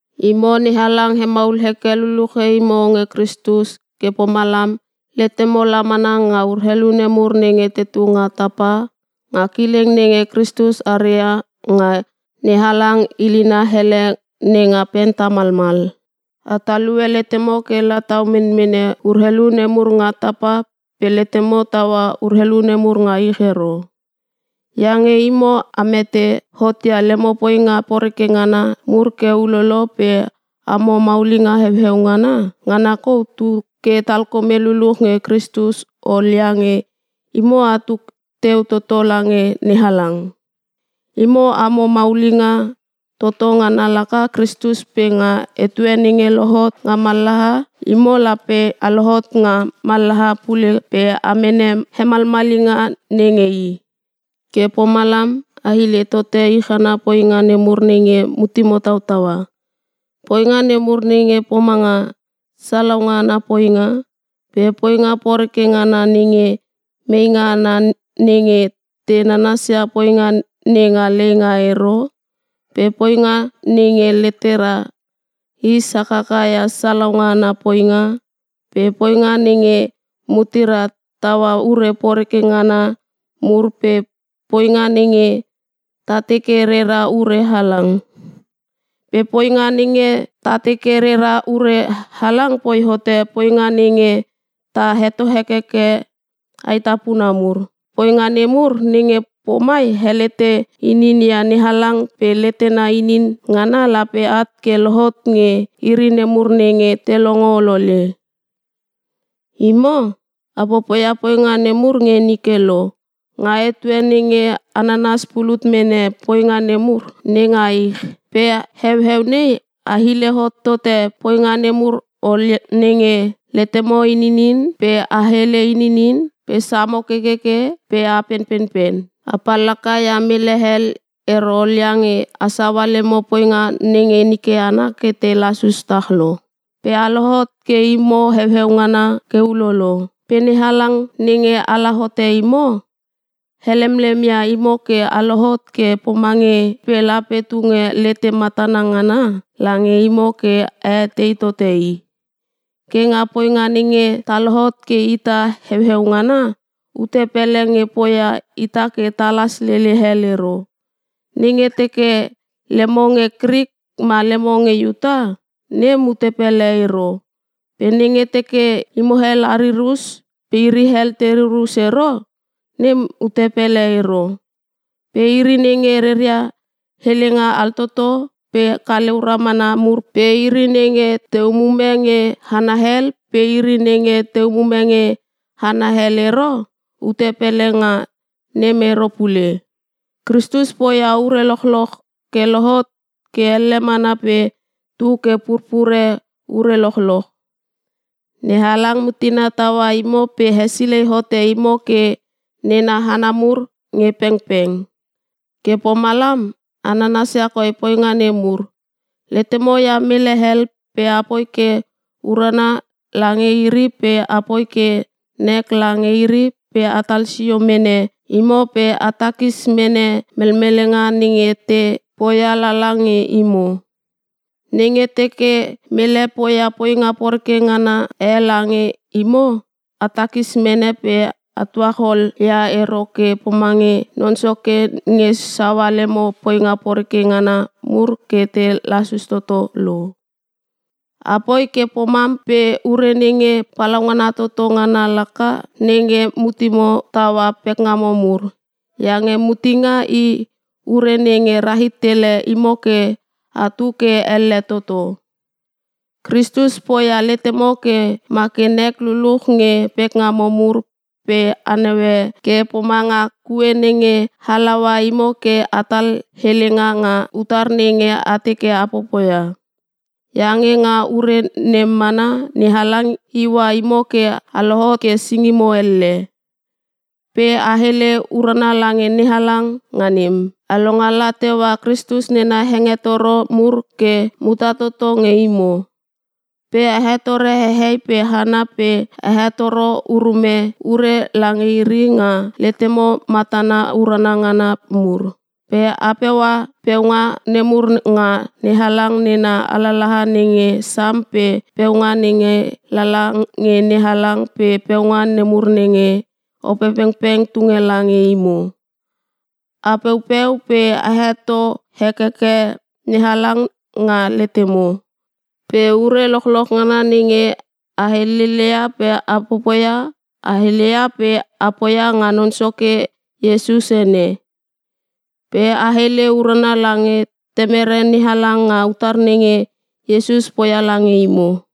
Imo NeHalang hemaul heke luluche imo nge Kristus ke pomalam letemo la mana nga urelu nemur nenge tetu nga tapa, nga kileng nenge Kristus are ia nga NeHalang ilina ele nenga pen tamalmal. A talue letemo ke la tau menmene urelu nemur nga tapa pe letemo taua urelu nemur nga ich ero. Iange imo a mete hot ia lemo poinga poreke ngana mur ke ulolo pe amo maulinga heueu ngana, ngana kou tu ke talkome luluch nge Kristus ol iange imo atu teu toto lange NeHalang. Imo amo maulinga toto ngana laka Kristus pe nga etue nenge lohot nga mallaha, imo lape a lohot nga mallaha pule pe a mene hemalmalinga nenge i. Ke pomalam a hile tote ich ana poinga nemur nenge mutemo tautaua. Poinga nemur nenge pomanga: Salaunga ana poinga, pe poinga poreke ngana nenge meinga ana nenge te nanasia poinga nenga leinga ero, pe poinga nenge letera is hakaka ia salaunga ana poinga, pe poinga nenge mutera taua ure poreke ngana mur, pe poinga nenge ta teke rera ure halang. Pe poinga nenge ta teke rera ure halang poi hote poinga nenge ta heto hekeke aetapuna mur. Poinga nemur nenge pomai helete inin ia NeHalang pe letena inin ngana lape at ke lohot nge iri nemur nenge te longo olole. Imo, a popoia poinga nemur nge nike lo, nga etue nenge a nanas pulut mene poinga nemur nenga ich. Pe heueu nei a hile hot tote poinga nemur ol nenge: letemo ininin, pe a hele ininin, pe samo kekeke, pe a penpenpen. A pallaka ia mele hel ero ol iange a saua lemo poinga nenge nike ana ke te lasus tah lo. Pe a lohot ke imo heueu ngana ke ulolo. Pe NeHalang nenge ala hote imo, helemlem ia imo ke a lohot ke pomange i pe lape tunge lete matana ngana lange imo ke a etei tote i. Ke nga poinga nenge ta lohot ke ita heueu ngana, ute pele nge poia ita ke talas lele hel ero. Nenge teke lemo nge Krik ma lemo nge Iuta, nem ute pele ero. Pe nenge teke imo hel a ririr us pe iri hel te ririr us ero, nem ute pele ero. Pe iri nenge reria helenga altoto pe kaleu ramana mur pe iri nenge te umume nge hana hel pe iri nenge te umume nge hana hel ero; ute pele nga nem ero pule. Kristus poia ure lochloch ke lohot ke elle mana pe tu ke purpure ure lochloch. NeHalang mutena taua imo pe hesilei hote imo ke nena hana mur nge pengpeng. Ke pomalam a nanasia koi poinga nemur: Letemo ia mele hel pe apoi ke urana lange iri pe apoi ke nek lange iri pe atal sio mene imo pe a takis mene melmelenga nenge te poia lala nge imo. Nenge teke mele poia poinga poreke ngana e lange imo a takis mene pe a tuachol ia ero ke pomange Non Soke nge saua lemo poinga poreke ngana mur ke te lasus toto lo. Apoi ke pomam pe ure nenge palaungana toto ngana laka nenge mutemo taua pekngamo mur. Iange mutenga i ure nenge rahit tele imo ke atu ke elle toto. Kristus poia letemo ke ma ke nek luluch nge pekngamo mur pe a naue ke pomanga kue nenge halaua imo ke atal helenga nga utar nenge a teke a popoia. Iange nga ure nem mana NeHalang iua imo ke a lohot ke singimo elle. Pe a hele urana lange NeHalang nga nem. A longala teua Kristus nena hengetoro mur ke muta toto nge imo. Pe a hetore hehei pe hana pe a hetoro urume ure lange iri nga letemo matana urana ngana mur. Pe a peua peunga nemur nga NeHalang nena alalaha nenge Sam pe peunga nenge lala nge NeHalang pe peunga nemur nenge Opepengpeng tunge lange imo. A peupeu pe a heto hekeke NeHalang nga letemo. Pe ure lochloch ngana nenge a helele ia pe a popoia, a heleia pe a poia nga Non Soke Iesus ene. Pe a hele urana lange Temere NeHalang nga utar nenge Iesus poia lange imo.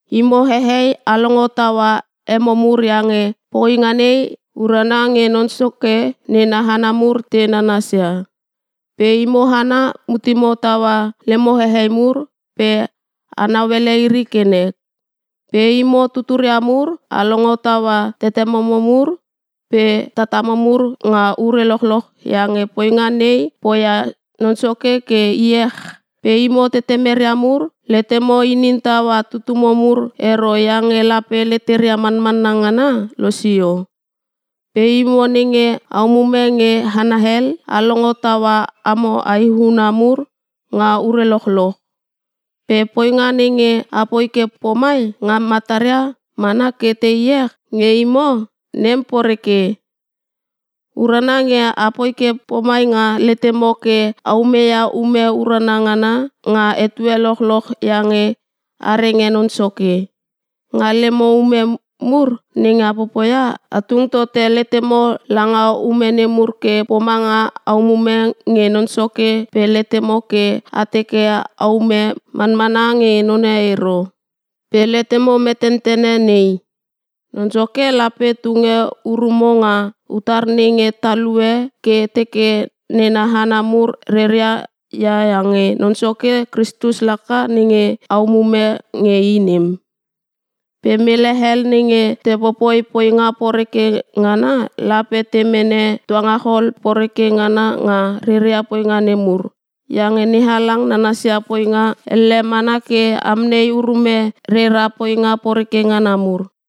Imo hehei a longo taua emo mur iange poinga nei urana nge Non Soke nena hana mur te nanasia. Pe imo hana mutemo taua lemo hehei mur pe a nauele iri ke nek. Pe imo tuturia mur, a longo taua tetememo mur pe tatamo mur nga ure lochloch iange poinga nei poia Non Soke ke iech. Pe imo tetemeria mur, letemo inin taua tutumo mur ero iange lape leteria manmanna ngana losio. Pe imo nenge a umume nge hana hel, a longo taua amo aehuna mur nga ure lochloch. Pe poinga nenge apoi ke pomai nga mataria mana ke te iech nge imo, nem poreke. Urana nge apoi ke pomai nga letemo ke a umeia ume urana ngana nga etue lochloch iange a renge Non Soke. Nga lemo ume mur nenge a popoia, a tung tote letemo langa ume nemur ke pomanga a umume nge Non Soke pe letemo ke a teke aume manmana nge none ero. Pe letemo metentene nei: Non Soke lape tunge urumo nga utar nenge talue ke teke nena hana mur reria ia iange Non Soke Kristus laka nenge a umume nge i nem. Pe mele hel nenge te popoi poinga poreke ngana lape te mene tuangachol poreke ngana nga reria poinga nemur, iange NeHalang nanasia poinga elle mana ke amnei urume rera poinga poreke ngana mur.